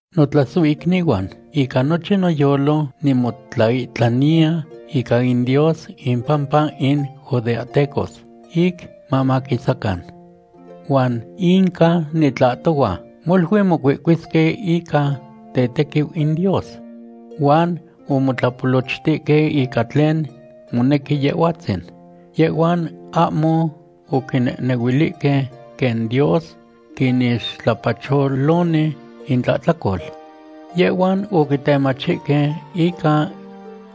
Notlasohicnihuan, ica nochin noyolo nimotlaihtlaniya ica in Dios impampa in judeahtecos, ic mamaquisacan. Huan inca nitlahtohua, molui mocuihcuisque ica tetequiu in Dios. Huan omotlapolochtihque ica tlen monequi Yehhuatzin. Yehhuan ahmo oquinehnehuilihque quen Dios quinixtlapacholoni intlahtlacol. Yehhuan oquitemachihque ica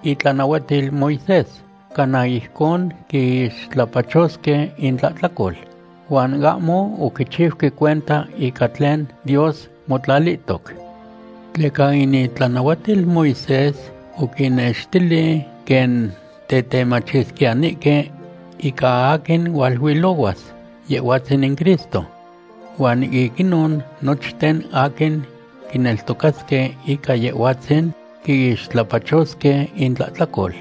itlanahuatil Moisés cana ijcon quiixtlapachosque intlahtlacol, huan ahmo oquichiuque cuenta ica tlen Dios motlalihtoc. Tleca in itlanahuatil Moisés oquinnextili quen tetemachisquiyanihque ica aquin hualuilohuas, Yehhuatzin in Cristo. Huan ic inon nochten aquin quineltocasque ica Yehhuatzin quiixtlapachosque intlahtlacol.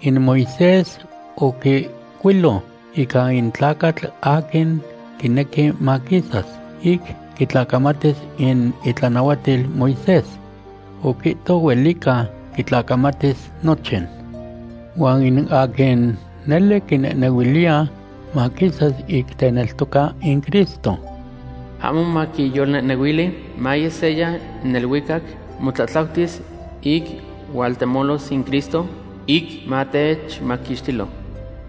In Moisés oquihcuilo ica in tlacatl aquin quinequi maquisas ic quitlacamatis in itlanahuatil Moisés. Oquihto huelica quitlacamatis nochin. Huan in aquin nele quinehnehuiliya maquisas ic teneltoca in Cristo, ahmo maquiyolnehnehuili: “Maye seya neluicac motlatlautis ic hualtemolos in Cristo”, ic matechmaquixtilo.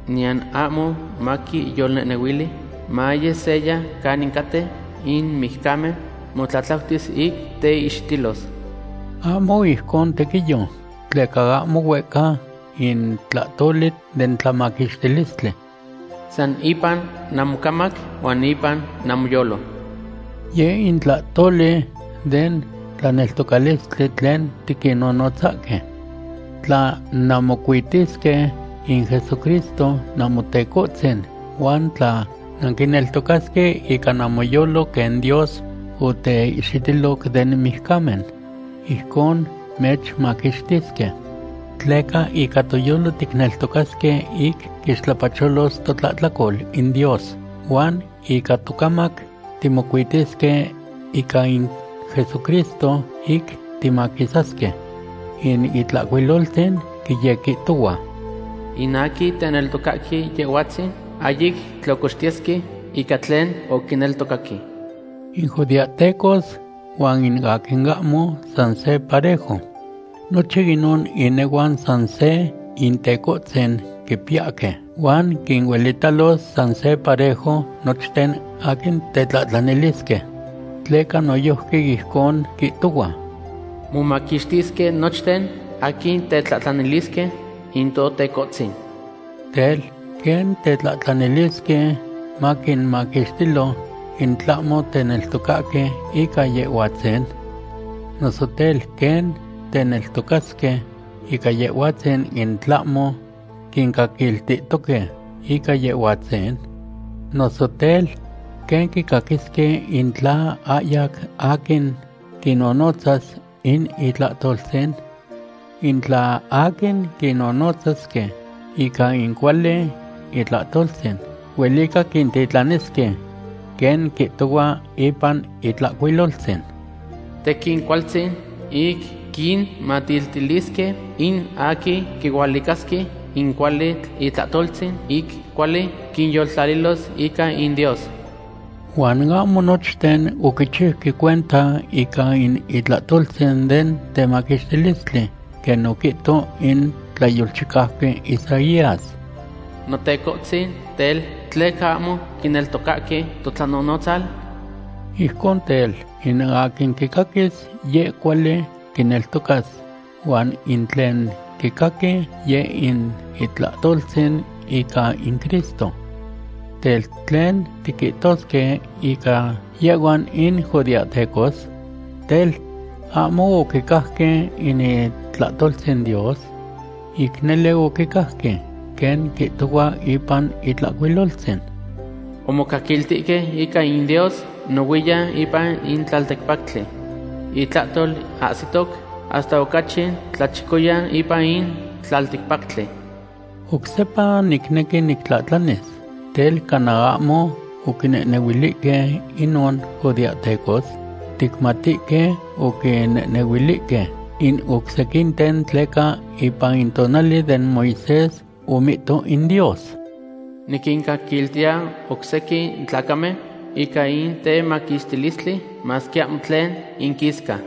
Niyan ahmo maquiyolnehnehuili: “Maye seya canin caten in mijcamen motlatlautis ic teihxitilos.” Ahmo ijcon tequiyo, tleca ahmo huehca in tlahtoli den tlamaquixtilistli. San ipan namocamac huan ipan namoyolo. Yeh in tlahtoli den tlaneltocalistli tlen tiquinnonotzahque. Tla nanquimocuitisque in Jesucristo Namotecohtzin huan tla nanquineltocasque ica namoyolo quen Dios oteihxitiloc den mijcamen, ijcon mechmaquixtisque. Tleca ica toyolo ticneltocasque ic quixtlapacholos totlahtlacol in Dios, huan ica tocamac timocuitisque ica in Jesucristo ic timaquisasque. In Itlahcuiloltzin quiyequihtohua: “In aquin teneltocahque Yehhuatzin ahyic tlocoxtiyesque ica tlen oquineltocaque.” In judeahteco huan aquin ahmo san se parejo. Nochin inon inehuan san se Intecohtzin quipiyahque, huan quinuelitalos san se parejo nochten aquin tetlahtlanilisque. Tleca noyojqui ijcon quihtohua: “Momaquixtisque nochten aquin tetlahtlanilisque in Totecohtzin.” Tel, ¿quen tetlahtlanilisque maquinmaquixtilo in tlahmo teneltocahque ica Yehhuatzin? Noso tel, ¿quen teneltocasque ica Yehhuatzin, in tlahmo quincaquiltihtoque ica Yehhuatzin? Noso tel, ¿quen quicaquisque in tla ahyac aquin quinnonotzas in itlahtoltzin? In tla aquin quinnonotzasque ica in cuali itlahtoltzin, huelica quintitlanisque. Quen quihtohua ipan Itlahcuiloltzin: “¡Tequin cualtzin ic quinmatiltilisque in aquin quihualicasque in cuali itlahtoltzin ic cuali quinyoltlalilos ica in Dios!” Huan ahmo nochten oquichiuque cuenta ica in itlahtoltzin den temaquixtilistli. Quen oquihto in tlayolchicauqui Isaías: “Notecohtzin, tel, ¿tleca ahmo quineltocahque totlanonotzal?” Ijcon tel, in aquin quicaquis, yeh cuali quineltocas, huan in tlen quicaqui, yeh in itlahtoltzin ica in Cristo. Tel, ¿tlen tiquihtosque ica yehhuan in judeahtecos? Tel, ¿ahmo oquicajque in itlahtoltzin Dios? Ic nele oquicajque. Quen quihtohua ipan Itlahcuiloltzin: Omocaquiltihque ica in Dios nohuiyan ipan in tlalticpactli. Itlahtol ahsihtoc hasta ocachi tlachicoyan ipan in tlalticpactli. Oc sepa nicnequi nictlahtlanis: Tel, ¿cana ahmo oquinehnehuilihque inon judeahtecos? Ticmatihque oquinehnehuilihque in oc sequinten tleca ipan in tonali den Moisés, omihto in Dios: Niquincaquiltiya oc sequin tlacamen ica in temaquixtilistli, masque ahmo tlen inquisca.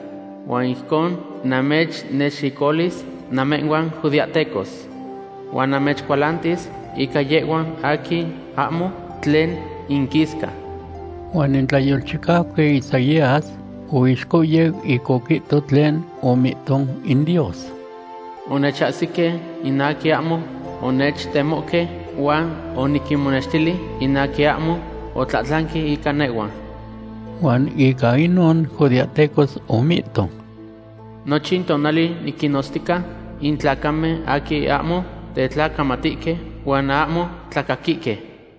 Huan ijcon namechnexicoluis namehhuan judeahtecos. Huan namechcualantis ica yehhuan aquin ahmo tlen inquisca. Huan in tlayolchicauqui Isaías oixcohyeu ic oquihto tlen omihto in Dios: Onechahsihque in aquin ahmo onechtemohque, huan oniquinmonextili in aquin ahmo otlahtlanque ica nehhua. Huan ica inon judeahtecos, omihto: “Nochin tonali niquinnotztica in tlacamen aquin ahmo tetlacamatihque huan ahmo tlacaquihque.”